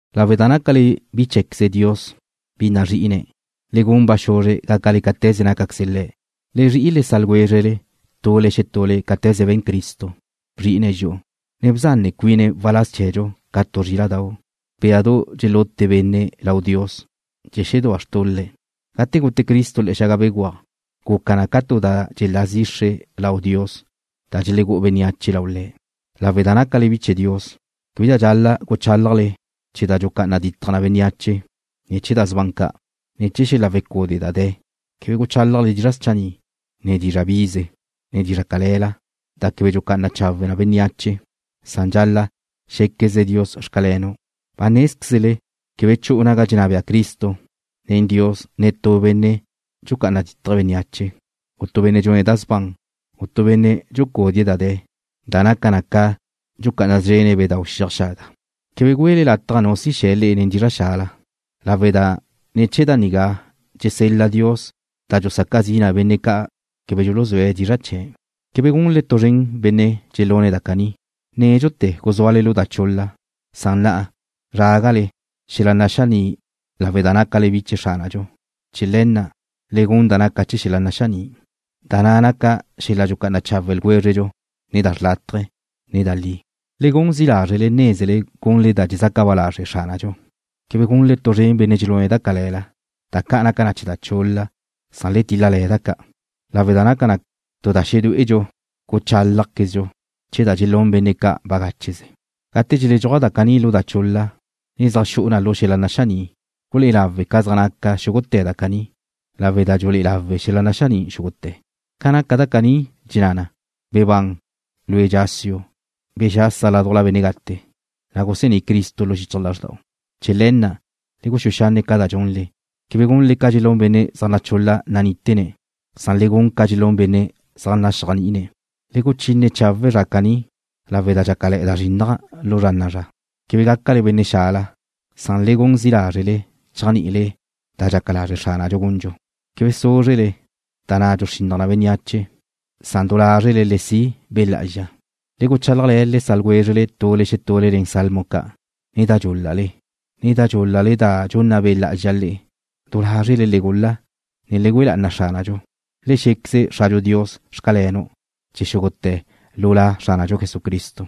Lawe' da nácale bi cheé̱queze Dios, bi nazri'ine̱', le gun ba xuzre gácale cáte̱ze nácaqueze Le̱'. Le zri'i le sa' ljwézrele tule xetule cáte̱ze be̱n Cristo, bzri'ine̱' dxi'u, ne bzanne cuine̱' waláz chee̱dxu ca tu zríla'dau', béadu dxelute benne' lau Dios chee̱ xedúa xtul-le'. Gate gute Cristo le̱'e̱ xaga béguaj, guca ca tu da dxelá zixre lau Dios da dxelegú'u bénneache lau Le̱'. Lawe' da nácale bi chee̱ Dios, québedxa dxal-la' guchálajle chee̱ da dxucá'ana ditaj na bénneache, ne chee̱ da sban ca', ne chee̱ xel-la wecude' da de̱. Quebe guchálajle dizra' schanni', ne dizra' bize, ne dizra' cale̱la, da quebe dxulucá'ana na chawe' bénneache, san dxal-la' xé̱quezle Dios: “Xcalenu'.” Ba nézquezle quebe chu'u naga dxenná bea Cristo nen Dios netú benne' dxucá'ana dítaje̱' bénneache, u tu benne' dxune̱' da sban, u tu benne' dxucúdie̱' da de̱, da naca na ca dxucá'ana szrene̱' bedau' xiaj xaga. Quebe güele lataj nu si xe̱ le'e nen dizra' xala, lawe' da ne̱ chee̱ da nigá dxesel-la Dios da dxusaca zi na benne' ca' quebe dxuluzúe̱' dizra' chee̱'. Quebe gunle tu zren benne' dxelune̱' da caní. Nédxute̱ guzúale lu da chul-la, na' na'a zrágale xel-la naxaní' lawe' da nácale bi chee̱ Xránadxu. Chee̱ le̱ na', le gun da naca na chee̱ xel-la naxaní', da na' naca xel-la dxucá'ana chawe' ljwézredxu, ne da xlátaje̱, ne da li. Le gun zi' lázrele nézele gunle da dxezaca ba lazre' Xránadxu. Quebe gunle tu zren benne' dxelune̱' da cale̱la, da ca' naca chee̱ da chul-la, san le til-la da ca' lawe' da naca na tu da xedué'edxu guchálajzedxu chee̱ da dxelún benne' ca' bagácheze. Gate dxeledxúaj da caní lu da chul-la, ne zaj xu'u na lu xel-la naxaní', gulé'e lawe' ca zaj naca xúgute̱ da caní, lawe' da dxulé'e lawe' xel-la naxaní' xúgute̱. Ca naca da caní dxenná na: Bebán, lue' dxásiu'. Bexasa ládujla benne' gate, na' gusení' Cristo lu xichaj lazrda'u. Chee̱ le̱ na', le guxúe xanne' ca da dxunle. Quebe gunle ca dxelún benne' zaj nachul-la nanítene̱', san le gun ca dxelún benne' zaj naxéajni'ine̱'. Le guchine chawe' zra caní lawe' da dxácale̱'e̱ da zrinnaj lu zra na'a zra. Quebe gácale benne' xala, san le gun zi' lázrele chéajni'ile da dxaca lazre' Xránadxu gundxu. Quebe súzrele, da na' dxuxrinnaj na bénneache, san du lázrele le si' Be' Lá'azxa. Le guchálajle̱ le sa' ljwézrele tule xetule nen Salmo ca', ne nen da dxúl-lale, ne nen da du dxúl-lale da dxunna Be' Lá'azxa le'e. Du lázrele le gul-la, ne le güe lá'ana Xránadxu. Le xé̱queze Xradxu Dios: “Xcalenu'”, chee̱ xúgute̱ lu La Xránadxu Jesucristo.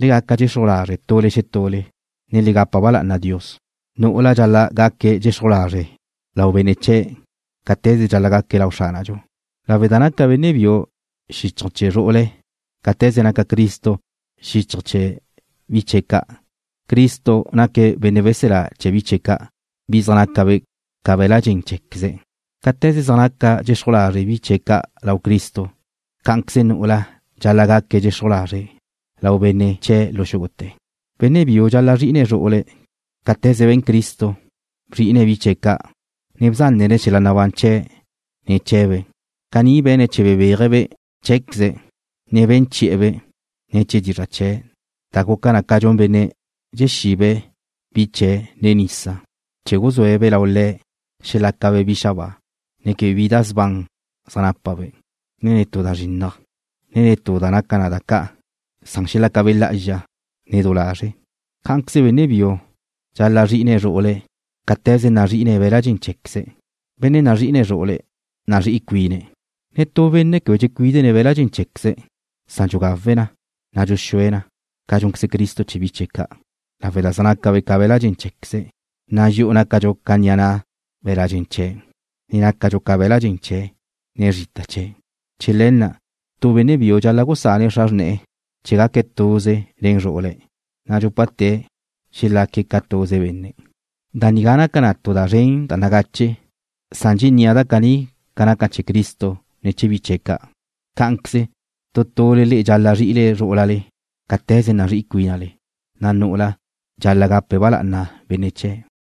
Le gaca dxexruj lazre' tule xetule, ne le gapa ba lá'ana Dios. Nu'ula dxal-la' gaque̱' dxexruj lazre' lau benne' chee̱', cáte̱ze dxal-la' gaque̱' lau Xránadxu, lawe' da naca benne' biu xíchaje̱ chee̱ zru'ule̱', cáte̱ze naca Cristo xíchaje̱ chee̱ bi chee̱' ca'. Cristo naque̱' Benne' weselá chee̱ bi chee̱' ca', bi zaj naca be̱' ca be̱l-la' dxen cheé̱queze̱'. Cáte̱ze zaj naca dxexruj lazre' bi chee̱' ca' lau Cristo, cá'anqueze nu'ula dxal-la' gaque̱' dxexruj lazre' lau benne' chee̱' lu xúgute̱. Benne' biu dxal-la' zrí'ine̱' zru'ule̱' cáte̱ze be̱n Cristo, bzri'ine̱' bi chee̱' ca', ne bzánene̱' xel-la nabán chee̱' ne̱ chee̱be'. Caní be̱ne̱' chee̱ bebéaje̱'-be' cheé̱queze̱', ne be̱n chi'e̱-be' ne̱ chee̱ dizra' chee̱', da guca na ca dxun benne' dxexibe̱' bi chee̱' nen nisa, chee̱ guzúe̱'-be' lau Le̱', xelácabe' bi xabáa, ne quebe bi da sban zaj nápabe', ne netú da zrinnaj, ne netú da naca na ca da ca', san xelácabe' lá'azxa, ne du lazre'. Cá'anqueze benne' biu dxal-la' zrí'ine̱' zru'ule̱' cáte̱ze nazri'ine̱' be̱l-la' dxen cheé̱queze̱'. Benne' nazri'ine̱' zru'ule̱' nazrí'i cuine̱'. Netú benne' quebe dxecuídene̱' be̱l-la' dxen cheé̱queze̱', san dxugawe̱' na, ne dxuxúe̱' na, ca dxúnqueze Cristo chee̱ bi chee̱' ca' lawe' da zaj nácabe' ca be̱l-la' dxen cheé̱queze̱', na' dxi'u nácadxu ca ni'a na' be̱l-la' dxen chee̱', ne nácadxu ca be̱la' dxen chee̱', ne zrita chee̱'. Chee̱ le̱ na' tu benne' biu dxal-la' gusane̱' xra xrne̱'e̱ chee̱ gaque̱' tuze nen zru'ule̱', na' dxúpate̱' xelaque̱' ca tuze benne'. Da nigá naca na tu da zren da nagache, na' dxennía' da caní ca naca chee̱ Cristo nen bi chee̱' ca'. Cá'anqueze tu tule le'e dxal-la' zri'ile zrú'ulale cáte̱ze nazrí'i cuínale, na' nu'ula dxal-la' gape̱' ba lá'ana benne' chee̱'.